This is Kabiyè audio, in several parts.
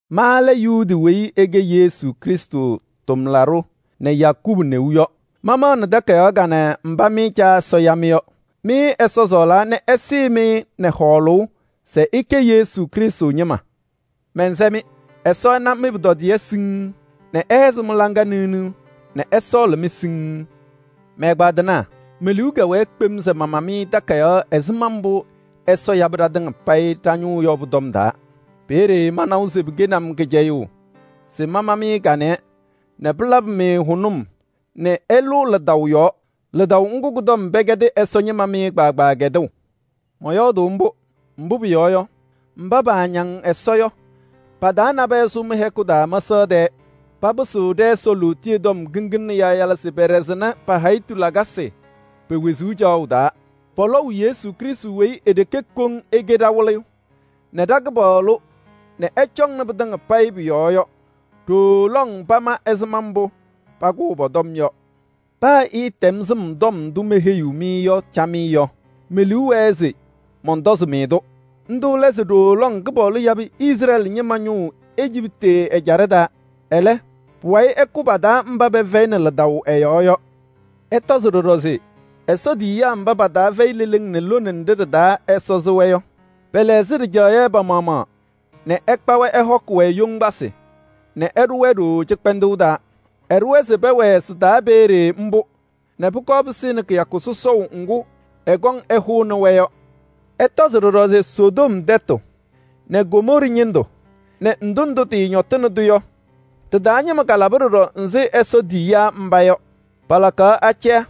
Ma lɛ Yuudi weyi ɛkɛ Yesu Krɩstʋ tʋmlaɖʋ nɛ Yakubu neu yɔ. Mamaɣnɩ takayaɣ kanɛ mba mɩ Caa Ɛsɔ ya-mɩ yɔ. Mɩ ɛsɔɔlaa nɛ ɛsɩɩ-mɩ nɛ hɔɔlʋʋ se ɩkɛ Yesu Krɩstʋ ñɩma. Mɛnsɛ-mɩ: Ɛsɔ ɛna mɩ-pʋtɔdɩyɛ siŋŋ nɛ ɛhɛzɩ mɩ-laŋa niɣniɣ nɛ ɛsɔɔlɩ-mɩ siŋŋ. Mɛ-ɛgbaadɩnaa! Me-liu kɛwɛɛ kpem se mama-mɩ takayaɣ ɛzɩma mbʋ Ɛsɔ yabɩ ɖatɩŋa payɩ ɖa-ñʋʋ yɔ pʋ-tɔm taa. Peeye manawa se pɩkɛnɩ-m kɩcɛyʋʋ se mama-mɩ kanɛ nɛ pɩlabɩ-mɩ hʋnʋm nɛ ɩlʋ lidaʋ yɔɔ. Lidaʋ ŋgʋ kʋ-tɔm pɛkɛdɩ Ɛsɔ ñɩma mɩ kpaagbaa kɛdʋʋ. Mɔyɔɔdʋʋ mbʋ, mbʋ pʋyɔɔ yɔ, mba paañaŋ Ɛsɔ yɔ pa-taa nabɛyɛ sʋ mɩ-hɛkʋ taa mɛsaɣ tɛɛ. Papɩsɩɣ ɖɛ-Ɛsɔ lootiye tɔm kiŋgila nɛ yaayala se peɖesini pa-hayitu lakasɩ wezuu caɣʋ ñɩndʋ. Pɔlɔʋ Yesu Krɩstʋ weyi e-ɖeke koŋ ɛkɛ ɖa-Wɩlɩyʋ nɛ ɖa-Kɩpaɣlʋ nɛ ɛcɔŋnɩ pɩtɩŋa pʋ-yɔɔ yɔ. Ɖooo lɔŋ pama ɛzɩma mbʋ pakʋʋ pɔ-tɔm yɔ. Paa ɩtɛm sɩm tɔm ndʋ meheyiɣ-mɩ yɔ camɩyɛ yɔ, me-liu wɛɛ se mɔntɔzɩ-mɩ-tʋ. Ndʋ lɛ se ɖooo lɔŋ Kɩpaɣlʋ yabɩ Izrɛɛlɩ ñɩma ñʋʋ Ejiptɩ ɛjaɖɛ taa. Ɛlɛ, pʋwayɩ ɛkʋ pa-taa mba pɛfɛyɩnɩ lidaʋ ɛ-yɔɔ yɔ. Ɩtɔzɩ ɖɔɖɔ se Ɛsɔ tiyiyaa mba pa-taa fɛyɩ leleŋ nɛ lone nɖɩ ɖɩ-taa Ɛsɔ sɩ-wɛ yɔ, pɛlɛɣzɩ ɖɩjaɣyɛ pa-maɣmaɣ nɛ ɛkpa-wɛ ɛhɔkɩ-wɛ yoŋgbasɩ nɛ ɛɖʋ-wɛ ɖooo cɩkpɛndʋʋ taa. Ɛɖʋ-wɛ se pɛwɛɛ sɩ-taa peeye mbʋ nɛ pʋkɔɔ pɩsɩnɩ kɩyakʋ sɔsɔʋ ŋgʋ ɛkɔŋ ɛhʋnɩ-wɛ yɔ. Ɩtɔzɩ ɖɔɖɔ se Sodom tɛtʋ nɛ Gomɔɔrɩ ñɩndʋ nɛ ndʋ ndʋ tɩñɔtɩnɩ-tʋ yɔ, tɩ-taa ñɩma kalaba ɖɔɖɔ ɛzɩ Ɛsɔ tiyiyaa mba yɔ. Palakaɣ acɛyɛ,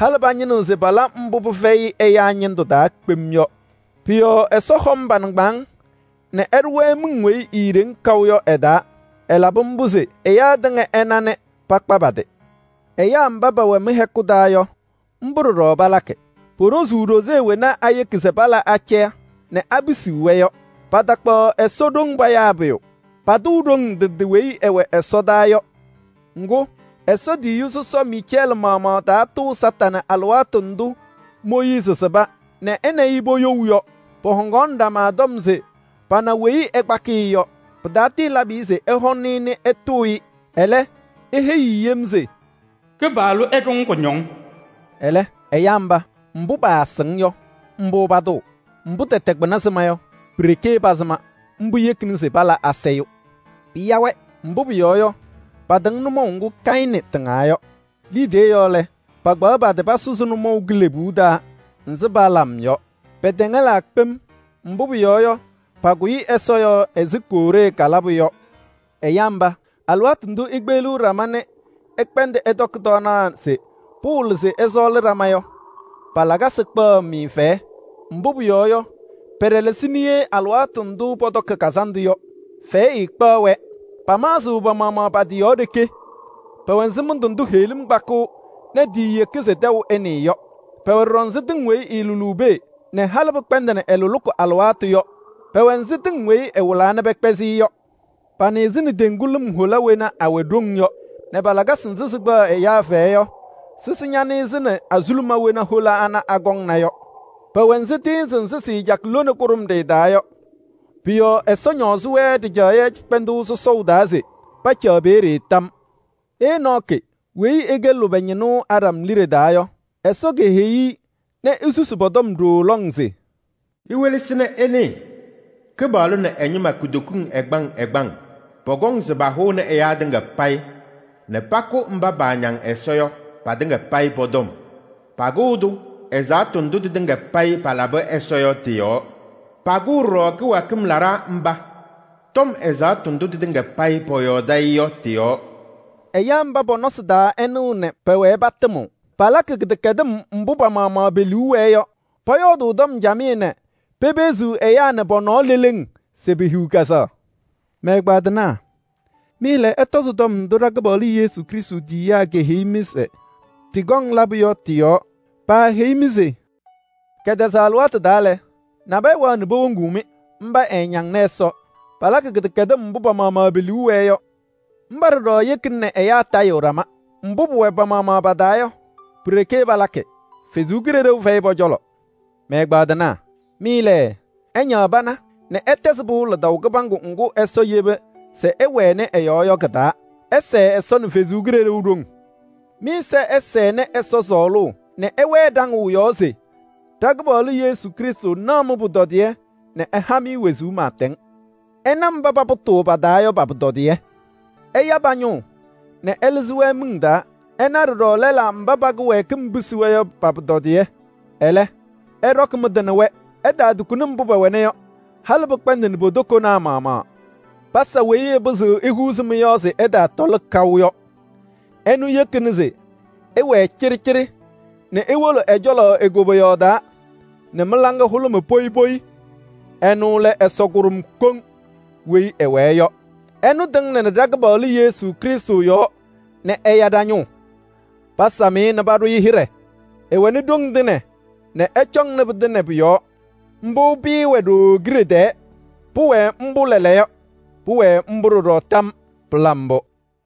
halɩ pañɩnɩɣ se pala mbʋ pɩfɛyɩ ɛyaa ñɩndʋ taa kpem yɔ. Pʋ-yɔɔ Ɛsɔ hɔm pa-nɩŋgbaaŋ nɛ ɛɖʋ-wɛ miŋ weyi eeɖeŋ kaʋ yɔ ɛ-taa. Ɛlabɩ mbʋ se ɛyaa tɩŋa ɛna nɛ pakpa pa-tɩ. Ɛyaa mba pɛwɛ mɩ-hɛkʋ taa yɔ, mbʋ ɖɔɖɔ palakɩ. Poɖozuu ɖoze wena ayeki se pala acɛyɛ nɛ apisiɣ-wɛ yɔ. Patakpaɣ Ɛsɔ ɖoŋ payaa pʋyʋ. Patʋʋ ɖoŋ ndɩ ndɩ weyi ɩwɛ ɛsɔdaa yɔ. Ŋgʋ, Ɛsɔ tiyiyu sɔsɔ Miicɛɛlɩ maɣmaɣ taatʋʋ Kañadʋ Satanɩ alɩwaatʋ ndʋ Mooyiizi sɩba nɛ ɛ nɛ ɩ poyou yɔ. Pɔhɔŋaɣnɩ ɖama tɔm se pana weyi ɛkpakɩɣ-ɩ yɔ. Pɩtatɩɩlabɩ-ɩ se ɛhʋnɩ-ɩ nɛ ɛtʋʋ-ɩ. Ɛlɛ, eheyi-i yem se: “Kɩpaɣlʋ ɛɖʋ-ŋ kʋñɔŋ!” Ɛlɛ, ɛyaa mba, mbʋ paanɩɣ pɩ-taa yɔ, mbʋ patʋʋ. Mbʋ tɛtɛ kpɩna sɩma yɔ, pi-ɖeke pasɩma. Mbʋ yekini se pala asayʋʋ. Pɩya-wɛ! Mbʋ pʋyɔɔ yɔ, patɩŋ nʋmɔʋ ŋgʋ Kayɩnɩ tɩŋaa yɔ. Liidiye yɔɔ lɛ, pakpaɣ pa-tɩ pasʋzɩ nʋmɔʋ kilebuu taa ɛzɩ Balaam yɔ. Pɛtɛŋɛlaa kpem, mbʋ pʋyɔɔ yɔ, pakʋyɩ Ɛsɔ yɔɔ ɛzɩ Kooree kalabʋ yɔ. Ɛyaa mba, alɩwaatʋ ndʋ ikpeɣliɣ ɖama nɛ ɩkpɛndɩɣ ɩtɔkɩ tɔɔnaɣ se pɩwɩlɩ se ɩsɔɔlɩ ɖama yɔ, pa-lakasɩ kpaɣ-mɩ fɛyɛ. Mbʋ pʋyɔɔ yɔ, pɛɖɛlɛsɩɣ niye alɩwaatʋ ndʋ pɔtɔkɩ kazandʋ yɔ, fɛyɛ ɛɛkpaɣ-wɛ. Pamaɣzɩɣ pa-maɣmaɣ pa-tɩ yɔɔ ɖeke. Pɛwɛ ɛzɩ mɩndʋ ndʋ heɣlim kpakɩɣ nɛ tiiyeki se tɛʋ ɛnɩɩ yɔ. Pɛwɛ ɖɔɖɔ ɛzɩ tɩŋ weyi ɩɩlʋlʋʋ pee nɛ halɩ pɩkpɛndɩnɩ ɩ-lʋlʋʋ alɩwaatʋ yɔ. Pɛwɛ ɛzɩ tɩŋ weyi ɩwɩlaa nɛ pɛkpɛzɩ-ɩ yɔ. Panɩɣzɩnɩ teŋgu lɩm hola wena awɛ ɖoŋ yɔ nɛ pa-lakasɩ nzɩ sɩkpaɣ ɛyaa fɛyɛ yɔ sɩsɩ ñanɩɣzɩnɩ azuluma wena hola ana akɔŋna yɔ. Pɛwɛ ɛzɩ tɩɩnzɩ nzɩ sɩɩcakɩ lone kʋɖʋmɖɩyɛ taa yɔ. Pʋ-yɔɔ Ɛsɔ ñɔɔzɩ-wɛ ɖɩjaɣyɛ cɩkpɛndʋʋ sɔsɔʋ taa se pacaɣ peeye tam. Enɔɔkɩ weyi ɛkɛ lʋbɛ ñɩnʋ Aɖam liɖe taa yɔ, Ɛsɔ keheyi-i nɛ esusi pɔ-tɔm ɖooo lɔŋ se: “Iwelesi nɛ ɩnɩɩ, Kɩpaɣlʋ nɛ ɛ-ñɩma kutokiŋ ɛgbaŋ ɛgbaŋ pɔkɔŋ se pahʋnɩ ɛyaa tɩŋa payɩ nɛ pakʋ mba paañaŋ Ɛsɔ yɔ patɩŋa payɩ pɔ-tɔm. Pakʋʋ-tʋ ɛzaɣtʋ ndʋ tɩtɩŋa payɩ palabɩ Ɛsɔ yɔ tɩ-yɔɔ. Pakʋʋ ɖɔɖɔ kɩwɛɛkɩm laɖaa mba tɔm ɛzaɣtʋ ndʋ tɩtɩŋa payɩ pɔyɔɔdɩ-ɩ yɔ tɩ-yɔɔ.” Ɛyaa mba, pɔ-nɔsɩ taa ɛɛnɩɣ nɛ pɛwɛɛ patɩmɩɣ. Palakɩ kɩdɛkɛdɩm mbʋ pa-maɣmaɣ pe-liu wɛɛ yɔ. Pɔyɔɔdʋʋ tɔm camɩyɛ nɛ pepeɣziɣ ɛyaa nɛ pɔ-nɔɔ leleŋ se pehiɣ kɛzɛɣ. Mɛ-ɛgbaadɩnaa! Mɩ lɛ, ɩtɔzɩ tɔm ndʋ ɖa-Kɩpaɣlʋ Yesu Krɩstʋ tiyiyaa keheyi-mɩ se tɩkɔŋ labʋ yɔ tɩ-yɔɔ. Paaheyi-mɩ se: “Kɛtɛzaɣ alɩwaatʋ taa lɛ, nabɛyɛ wɛɣ nɛ powoŋuu-mɩ. Mba ɛɛñaŋnɩ Ɛsɔ, palakɩ kɩdɛkɛdɩm mbʋ pa-maɣmaɣ pe-liu wɛɛ yɔ.” Mba ɖɔɖɔ yekina nɛ ɛyaa tayɩɣ ɖama. Mbʋ pʋwɛ pa-maɣmaɣ pa-taa yɔ, pi-ɖeke palakɩ. Ɛsɔ Kalɩzaɣ fɛyɩ pɔ-cɔlɔ. Mɛ-ɛgbaadɩnaa! Mɩ lɛ, ɩñaɣ pana nɛ ɩtɛzɩ pɩʋ lidaʋ kɩbaŋgʋ ŋgʋ Ɛsɔ yeba se ɩwɛnɩ ɛ-yɔɔ yɔ kɩ-taa. Ɩsɛɛ Ɛsɔ nɛ ɛ-Kalɩzaɣ ɖoŋ. Mɩ-ɛza ɛsɛnɩ Ɛsɔ sɔɔlʋʋ nɛ ɩwɛɛ ɖaŋʋʋ yɔɔ se ɖa-Kɩpaɣlʋ Yesu Krɩstʋ naɣ mɩ-pʋtɔdɩyɛ nɛ ɛha-mɩ wezuu pɩɩtɛŋ. Ɩna mba papʋtʋʋ pa-taa yɔ pa-pʋtɔdɩyɛ: ɩya pa-ñʋʋ nɛ ɩlɩzɩ-wɛ miŋ taa. Ɩna ɖɔɖɔ lɛlaa mba pa-kɩwɛɛkɩm pisi-wɛ yɔ pa-pʋtɔdɩyɛ. Ɛlɛ, ɩɖɔkɩ mɩ-tɩ nɛ wɛ. Ɩtaatukuni mbʋ pɛwɛna yɔ, halɩ pɩkpɛndɩnɩ po-tokonaa maɣmaɣ. Pasa weyi ɛpɩzɩɣ ehuuzi mɩ-yɔɔ se ɩtaatɔlɩ kaʋ yɔ. Ɛnʋ yekini se ɩwɛɛ cɩɖɩcɩɖɩ nɛ iwolo ɛ-cɔlɔ e-koboyaɣ taa nɛ mɩ-laŋa hʋlʋmɩ poyi poyi. Ɛnʋ lɛ Ɛsɔ kʋɖʋm koŋ weyi ɛwɛɛ yɔ. Ɛnʋ tɩŋnɩnɩ ɖa-Kɩpaɣlʋ Yesu Krɩstʋ yɔɔ nɛ ɛya ɖa-ñʋʋ. Pasam-ɩ nɛ paɖʋ-ɩ hɩɖɛ. Ɛwɛnɩ ɖoŋ tɩŋa nɛ ɛcɔŋnɩ pɩtɩŋa pʋ-yɔɔ. Mbʋ pɩɩwɛ ɖooo kiɖe tɛɛ. Pʋwɛɛ mbʋ lɛɛlɛɛyɔ, pʋwɛɛ ɖɔɖɔ mbʋ tam yɔɔ! Pɩla mbʋ!